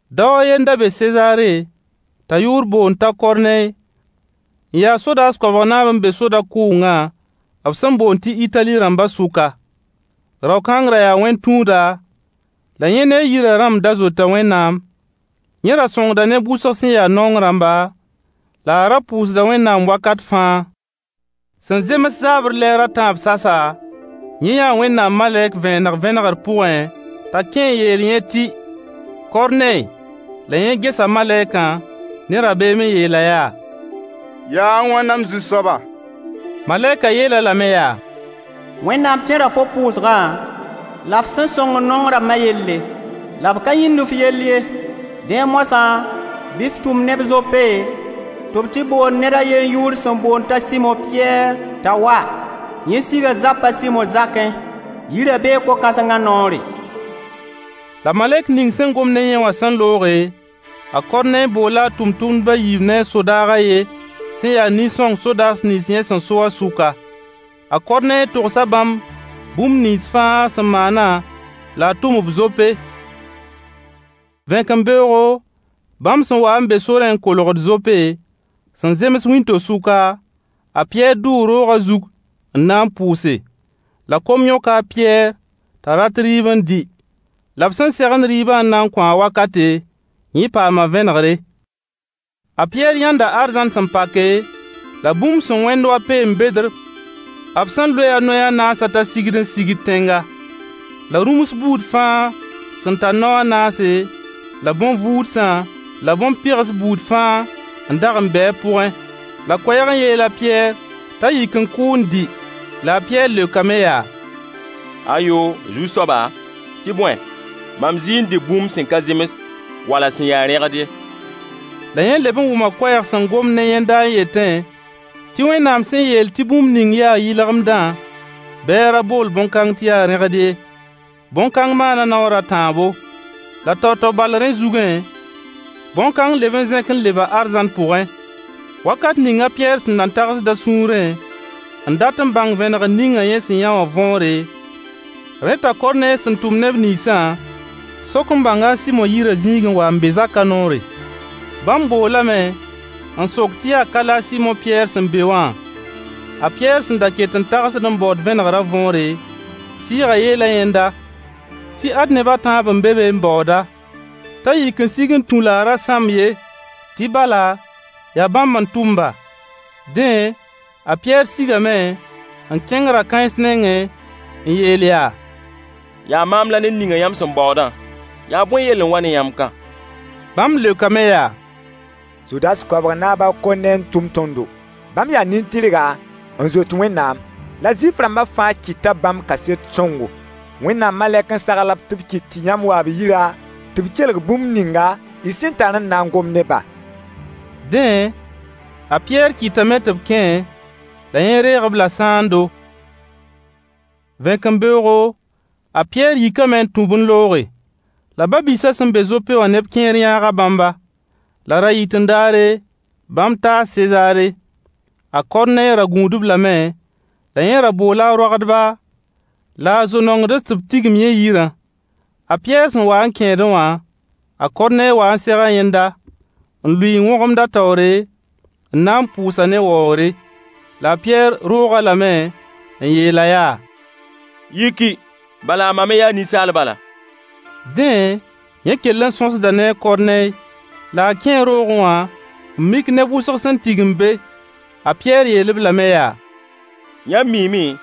Dao a ye n da be Sezaare t'a yʋʋr boond t'a Korney n ya sodaas koabg naab n be soda-kʋʋngã b sẽn boond tɩ Itali rãmba sʋka. Rao-kãng ra yaa wẽn-tũuda, la yẽ ne a yirã rãmb ra zoeta Wẽnnaam. Yẽ ra sõngda neb wʋsg sẽn ya naong rãmba, la a ra pʋʋsda Wẽnnaam wakat fãa. Sẽn zems zaabr lɛɛr a tãab sasa, yẽ yãa Wẽnnaam malɛk vẽeneg vẽnegr pʋgẽ t'a kẽ n yeel yẽ tɩ Korney. La yẽ gesa malɛk ne rabeem n yeel-a yaa: Yaa a wãna m Zu-soaba? Malɛk yeel-a lame yaa: Wẽnnaam tẽra fo pʋʋsgã la f sẽn sõngd naong rãmba yelle, la b ka yĩnd f yell ye. Dẽ moasã, bɩ f tʋm neb Zope tɩ b tɩ bool ned a yen yʋʋr sẽn boond t'a Sɩmo Pɩyɛɛr t'a wa. Yẽ siga zap a Sɩmo zakẽ, yirã bee ko-kãsenga noore. La malɛk ning sẽn gom ne yẽ wã looge, a Korney boola a tʋmtʋmdb a yiib ne a sodaag a yen sẽn ya nin-sõng sodaas nins yẽ sẽn so wã sʋka. A Korney togsa bãmb bũmb nins fãa sẽn maana la a tʋm-b Zope. Vẽkembeoogo, bãmb sẽn waa n be sorẽ n kolgd Zope, sẽn zems wĩnto-sʋka, a Pɩyɛɛr dʋʋ roogã zug n na n pʋʋse. La kom yõka a Pɩyɛɛr t'a rat rɩɩb n dɩ. La b sẽn segend rɩɩbã n na n kõ-a wakate, yẽ paama vẽnegre. A Pɩyɛɛr yãnda arzãn sẽn pake, la bũmb sẽn wẽnd wa peen-bedr b sẽn loe a noy a naasã t'a sigd n sigd tẽnga. La rũms buud fãa sẽn tar nao a naase, la bõn-vuudsã la bõn-pɩgs buud fãa n dag n be a pʋgẽ. La koɛɛg n yeel a Pɩyɛɛr t'a yik n kʋ ne dɩ. La a Pɩyɛɛr leokame yaa: Ayo, Zu-soaba, tɩ bõe mam zɩɩ n dɩ bũmb sẽn ka zems wala sẽn ya rẽgd ye. La yẽ leb n wʋma koɛɛg sẽn gomd ne yẽnda n yetẽ tɩ Wẽnnaam sẽn yeel tɩ bũmb ning yaa yɩlgemdã bɩ a ra bool bõn-kãng tɩ yaa rẽgd ye. Bõn-kãng maana naoor a tãabo. La tao-tao bal rẽ zugẽ bõn-kãng leb n zẽk leba arzãn pʋgẽ. Wakate ninga a Pɩyɛɛr sẽn nan tagsd a sũurẽ n dat n bãng vẽnegr ninga yẽ sẽn yã wã võore, rẽ t'a Korney sẽn tʋm neb ninsã sok n bãnga a Sɩmo yirã zĩig n wa n be zaka noore. Bãmb boolame n sok tɩ yaa ka la a Sɩmo Pɩyɛɛr sẽn be wã? A Pɩyɛɛr sẽn da ket n tagsd n baood vẽnegra võore, sɩɩgã yeela yẽnda tɩ ad neb a tãab n be be n baood-a. T'a yik n sig n tũ la a ra sãmb ye tɩ bala yaa bãmb n tʋmba. Dẽ, a Pɩyɛɛr sigame n kẽng ra-kãens nengẽ n yeel yaa: Yaa maam la ned ninga yãmb sẽn baoodã, yaa bõe yell n wa ne yãmb ka? Bãmb leokame yaa: Sodaas koabg naab a Korney n tʋm tõndo. Bãmb yaa nin-tɩrga n zoet Wẽnnaam, la Zuif-rãmba fãa kɩta bãmb kaset sõngo. Wẽnnaam malɛk n sagl-b tɩ b kɩt yãmb wa b yirã tɩ b kelg bũmb ninga y sẽn tar n na n gom ne-bã. Dẽ, a Pɩyɛɛr kɩtame tɩ b kẽ, la yẽ reeg-b-la sãando. Vẽkembeoogo, a Pɩyɛɛr yikame n tũ-b n looge. La ba-biisã sẽn be Zope wã neb kẽer yãaga bãmba. La ra-yɩt-n-daare, bãmb taa Sezaare. A Korney ra gũudb lame, la yẽ ra boola a roagdba la a zo-nongds tɩ b tigim yẽ yirã. A Pɩyɛɛr sẽn wa n kẽedẽ wã, a Korney wa n sega yẽnda n lʋɩ n wõgemd a taoore, n na n pʋʋs-a ne waoogre. La a Pɩyɛɛr roog-a lame n yeel-a yaa: Yiki, bala mam me yaa ninsaal bala. Dẽ, yẽ kell n sõsda ne a Korney. La a kẽe roogẽ wã n mik neb wʋsg sẽn tigim be. A Pɩyɛɛr yeel-b lame yaa: Yãmb miime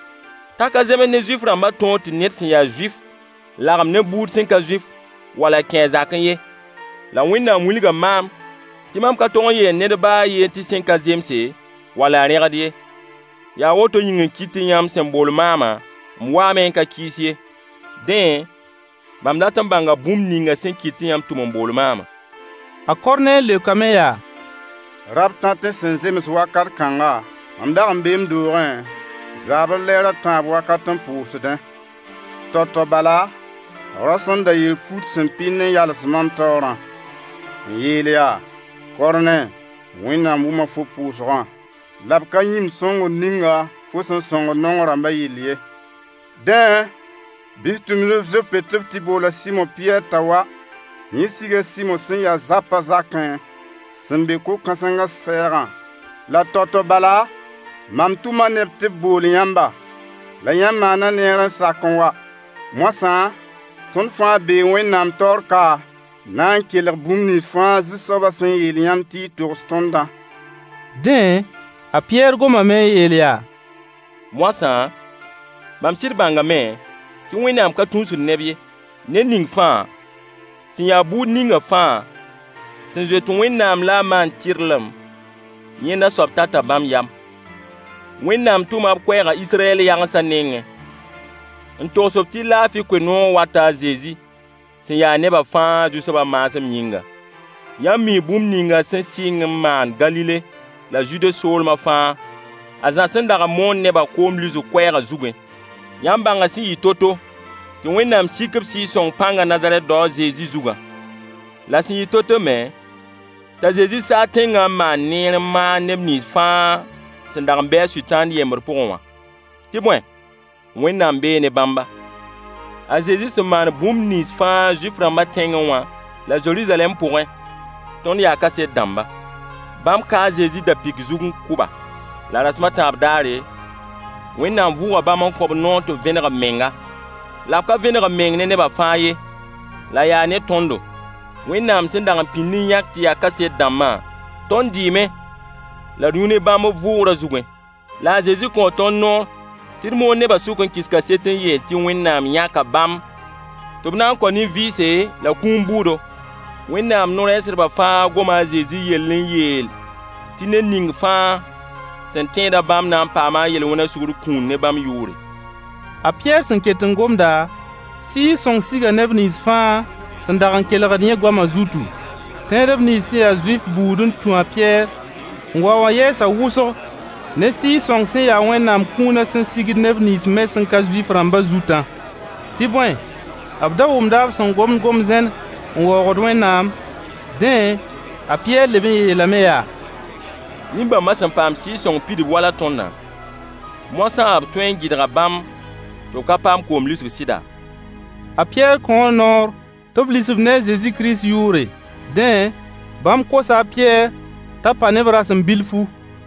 t'a ka zems ne Zuif-rãmba tõog tɩ ned sẽn ya Zuif lagem ne buud sẽn ka Zuif wala kẽ a zakẽ ye. La Wẽnnaam wilga maam tɩ mam ka tog n yeel ned ba yen tɩ sẽn ka zemse, wala rẽgd ye. Yaa woto yĩng n kɩt tɩ yãmb sẽn bool maama, m waame n ka kɩɩs ye. Dẽ, mam dat n bãnga bũmb ninga sẽn kɩt tɩ yãmb tʋm n bool maama. A Korney leokame yaa: Rab-tatẽ sẽn zems wakat kãnga, mam dag n bee m doogẽ zaabr lɛɛr a tãab wakat n pʋʋsdẽ. Tao-tao bala, rao sẽn da yer fut sẽn pɩnd n yals mam taoorã, n yeel yaa: Korney! Wẽnnaam wʋma fo pʋʋsgã, la b ka yĩmd sõngr ninga fo sẽn sõngd naong rãmbã yell ye. Dẽ, bɩ f tʋm neb Zope tɩ b tɩ bool a Sɩmo Pɩyɛɛr t'a wa. Yẽ siga a Sɩmo sẽn ya zapã zakẽ sẽn be ko-kãsengã sɛɛgã. La tao-tao bala mam tʋma neb tɩ b bool yãmba. La yãmb maana neer n sak n wa. Moasã, tõnd fãa bee Wẽnnaam taoor ka n na n kelg bũmb nins fãa Zu-soabã sẽn yeel yãmb tɩ y togs tõndã. Dẽ, a Pɩyɛɛr gomame n yeel yaa: Moasã, mam sɩd bãngame tɩ Wẽnnaam ka tũusd neb ye. Ned ning fãa, sẽn ya buud ninga fãa sẽn zoet Wẽnnaam la a maand tɩrlem, yẽnda soab tata bãmb yam. Wẽnnaam tʋma b koɛɛga Israyɛl yagensa nengẽ n togs-b tɩ laafɩ koe-noog wata a Zezi sẽn ya neba fãa Zu-soabã maasem yĩnga. Yãmb mii bũmb ninga sẽn sɩng n maan Galile la Zude soolma fãa a Zã sẽn dag n moond neba koom lisg koɛɛg zugẽ. Yãmb bãnga sẽn yɩ to-to tɩ Wẽnnaam sik b Sɩɩg-sõng pãngã Nazarɛt dao a Zezi zugã. La sẽn yɩ to-to me t'a Zezi saag tẽngã n maan neer n maag neb nins fãa sẽn dag n be Sʋtãana yembd pʋgẽ wã, tɩ bõe, Wẽnnaam bee ne bãmba. A Zezi sẽn maan bũmb nins fãa Zuif-rãmbã tẽngẽ wã la Zeruzalɛm pʋgẽ, tõnd yaa kaset dãmba. Bãmb ka a Zezi da-pɩk zug n kʋ-ba, la rasem a tãab daare, Wẽnnaam vʋʋga bãmb n kõ-b noor tɩ b vẽneg b menga. La b ka vẽneg b meng ne neba fãa ye. La yaa ne tõndo, Wẽnnaam sẽn dag n pĩnd n yãk tɩ ya kaset dãmbã tõnd dɩɩme la d yũ ne bãmb b vʋʋgrã zugẽ. La a Zezi kõo tõnd noor tɩ d moon neba sʋk n kɩs kaset n yeel tɩ Wẽnnaam yãka bãmb tɩ b na n kao nin-vɩɩse la kũum bʋʋdo. Wẽnnaam no-rɛɛsdbã fãa goma Zezi yell n yeel tɩ ned ning fãa sẽn tẽeda bãmb na n paama a yel-wẽn sugr kũun ne bãmb yʋʋre. A Pɩyɛɛr sẽn ket n gomda, Sɩɩg-sõng siga neb nins fãa sẽn dag n kelgd yẽ goama zutu. Tẽedb nins sẽn ya Zuif buud n tũ a Pɩyɛɛr n wa wã yɛɛs wʋsg ne Sɩɩg-sõng sẽn ya Wẽnnaam kũuna sẽn sigd neb nins me sẽn ka Zuif-rãmba zutã. Tɩ bõe, b da wʋmda b sẽn gom-zẽn n waoogd Wẽnnaam. Dẽ, a Pɩyɛɛr leb yeelame yaa: Nin-bãmba sẽn paam Sɩɩg-sõng pidb wala tõndã, moasã b tõe n gɩdga bãmb tɩ b ka paam koom lisg sɩda? A Pɩyɛɛr kõo noor tɩ b lis-b ne a Zezi Kirist yʋʋre. Dẽ, bãmb kosa a Pɩyɛɛr t'a pa ne-b rasem bilfu.